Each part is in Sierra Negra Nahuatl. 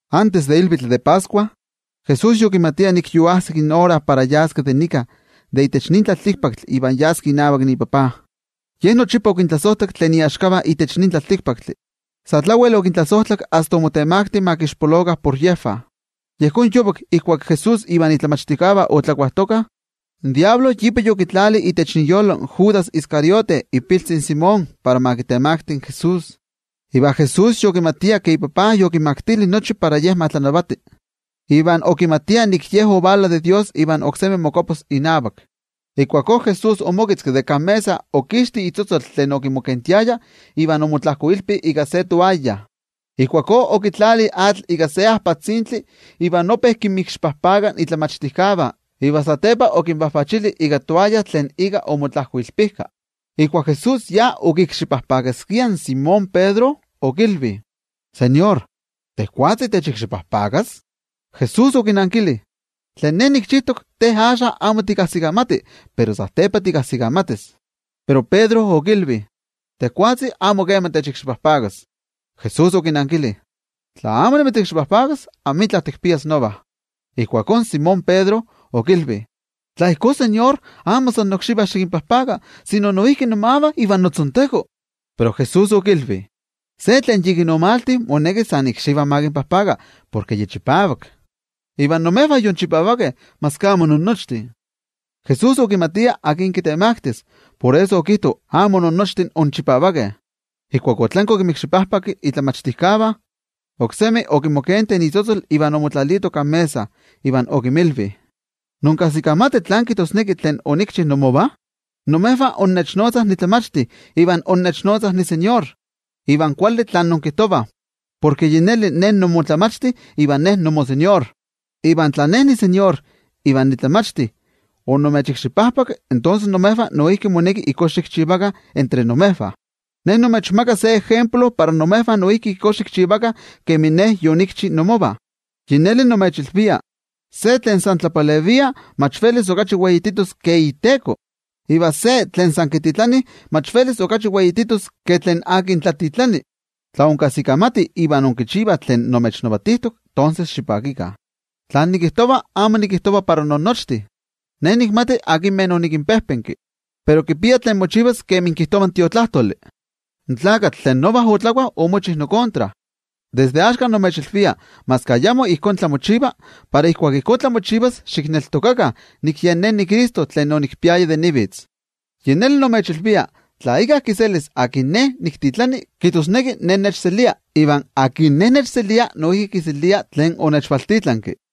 Antes de ilvitl de Pascua, Jesús yokimatia nik yoajsik ora para yaski de itech nin tlaltikpaktli iva yas inavak iTajtzi. Ye nochipa okintlasojtlak tlen iaxkavah itech nin tlaltikpaktli, sa tlawel okintlasojtlak asta omotemakti ma kixpolokah por yejvah. Yejón yovak, ijkuak Jesús ivan momachtijkeh otlakuajtokah, in Amo Kuali Tlakatl ipa yokitlalijka itech iyolo in Judas Iscariote, ipiltzi in Simón, para ma kitemakti in Jesús. Iva Jesús yokimatia ke iTajtzi yokimaktili nochi velitilistli itech nochi tlamantli, iva okimatia nik Ye ovala de Dios iva oksemi mokuapas inavak. Ijkuakó Jesús omoketzki de kan mesa, okixti itlaken tlen okimokentiaya, iva omotlajkoilpi ika se toaya. Ijkuakó okitlali atl ika se ajpatzintli iva ope kinmikxipajpaka in momachtijkeh iva satepa okinvajvachili ika toaya tlen ika omotlajkoilpijka. Ijkuak Jesús yokikxipajpakaskia in Simón Pedro, okilvi: —NoTeko, ¿tejwatzi techikxipajpakas? Jesús okinankili: —Tlen nikchijtok, te axka amo tikajsikamati, pero satepa tikajsikamatis. Pero Pedro okilvi: —Tejwatzi amo kema techikxipajpakas. Jesús okinankili: —Tla amo nimitzikxipajpakas, amitla tikpias nova. Ijkuakó Simón Pedro okilvi: —NoTeko, tla ijkó, amo san nokxivah xikinpajpaka, sino noijki nomavah iva notzonteko. Pero Jesús okilvi: —Se tlen yikin omalti, moneki san ikxivah ma kinpajpaka, porke ya chipavak. Iva imejvah yinchipavakeh, maski amo innochtin. Jesús okimatia akin kitemaktis, por eso okijto: “Amo innochtin inchipavakeh.” Ijkuak otlanki okimikxipajpaki in momachtijkeh, oksemi okimokenti itlaken iva omotlalito kan mesa, iva okinmilvi: —¿Inkajsikamatih tlán kijtosneki tlen onikchi inmovah? Imejvah innechnotzah nimoTlamachti iva nimoTeko, iva kuali tlen inkijtovah, porke yi neli Ne nimoTlamachti iva Ne nimoTeko. Iva tla Ne nimoTeko iva nimoTlamachti onimechikxipajpaki, tonses imejvah noijki moneki ijkó xikchivakah entre imejvah. Ne nimechmaka se ejemplo para imejvah noijki ijkó xikchivakah kemin Ne yonikchi inmovah. Yi neli nimechilvia, se tlen san tlapalevia mach velis okachi weititos ke iteko, iva se tlen san kititlanih mach velis okachi weititos ke tlen tlatitlani. Tla inkajsikamatih iva inkichivah tlen nimechilvijtok, tonses xipakikah. ’Tlen nikijtova amo nikijtova para innochtin. Ne nikmati akinmeh onikinpejpenki. Pero kipia tlen mochivas kemi kijtova in Tiotlajkuiloli: “In tlakatl tlen nova otlakua, omochi nokontra.” Desde axka nimechilvia maski ayamo ijkó tlamochiva, para ijkuak ijkó tlamochivas, xikneltokakah nik Yen Ne niCristo. Yi neli nimechilvia, tla íkka kiselis tlen Ne niktitlani, kijtosneki Ne nechselia, iva tlen Ne nechselia, noijki kiselia tlen onechvaltitlanki.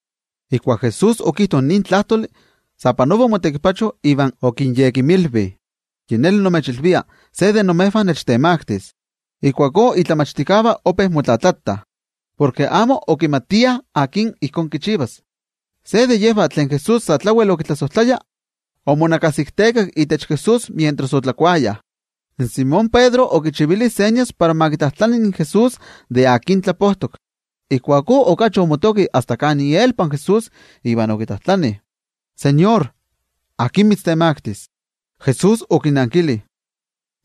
Ijkuak Jesús okijto nin tlajtoli, sa panova omotekipacho iva okinyekimilvi: —Yi neli nimechilvia, se de imejvah nechtemaktis. Ijkuakó in momachtijkeh ope motlatlajtlatah, porke amo okimatiah akin ijkó kichivas. Se de yejvah tlen Jesús sa tlawel okitlasojtlaya, omonakasiktekak itech Jesús mientras otlakuayah. In Simón Pedro okichivili señas para ma kitlajtlani in Jesús de akin tlapojtok. Ijkuakó okachi omotoki asta kan ielpa Jesús iva okitlajtlani: —NoTeko, ¿akin mitztemaktis? Jesús okinankili: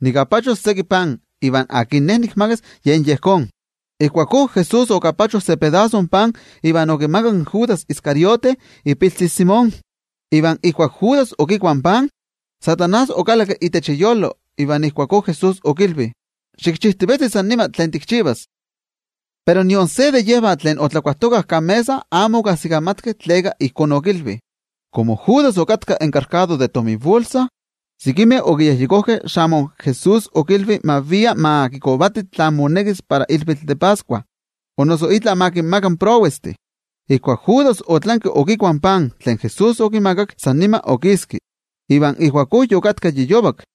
—Nikapachos seki pan, iva akin Ne nikmakas, yen yejón. Ijkuakó Jesús okapacho se pedaso pan iva okimakak in Judas Iscariote, ipiltzi in Simón. Iva ijkuak Judas okikua in pan, in Amo Kuali Tlakatl okalakki itech iyolo. Iva Ijkuakó Jesús okilvi: —Xikchijtivetzi san nima tlen tikchivas. Pero nion se de yejvah tlen otlakuajtokah kan mesa amo okajsikamatkeh tleka ijkó okilvi. Komo Judas yen okittaya in tominbolsa, sekimeh okiyejyekojkeh xamo in Jesús okilvi ma via ma kikovati tlen monekis para ilvitl de Pascua, o noso itla ma kinmaka tlen prowestih. Ijkuak Judas otlanki okikua in pan tlen Jesús okimakak, san nima okiski. Iva ijkuakó yokatka yi yovak.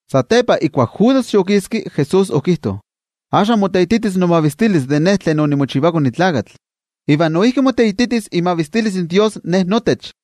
Satepa ijkuak Judas yokiski, Jesús okijto: —Axka moteititis imavistilis iKone in Tlakatl, iva noijki moteititis imavistilis in Dios itech Ye.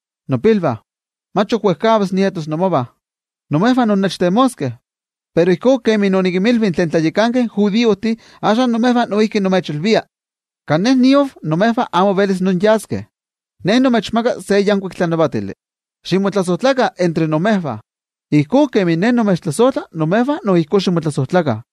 Nopilvah, mach ok wejkavas nietos inmovah. Imejvah innechtemoskeh. Pero ijkó kemi onikinmilvi tlen tlayakankeh judiojtih, axka imejvah noijki nimechilvia: Kan Ne niav, imejvah amo velis inyaskeh. Ne nimechmaka se yankuik tlanavatili: Ximotlasojtlakah entre imejvah. Ijkó kemin Ne nimechtlasojtla, imejvah noijki ijkó ximotlasojtlakah.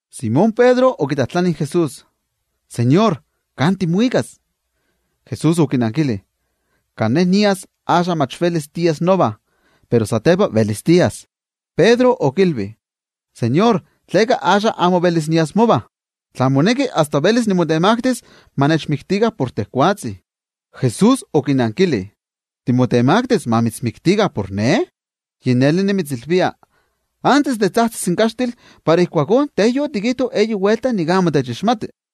Simón Pedro okitlajtlani in Jesús: —NoTeko, ¿kan timuikas? Jesús okinankili: —Kan Ne nias, axka mach velis tias nova. Pero satepa velis tias. Pedro okilvi: —NoTeko, ¿tleka axka amo velis nias mova? Tla moneki, asta velis nimotemaktis ma nechmiktikah por tejwatzi. Jesús okinankili: —¿Timotemaktis ma mitzmiktikah por Ne? Yi neli nimitzilvia, antes de tzajtzis in kaxtil, para ijkuakó te yotikijto eyi welta nik amo techixmati.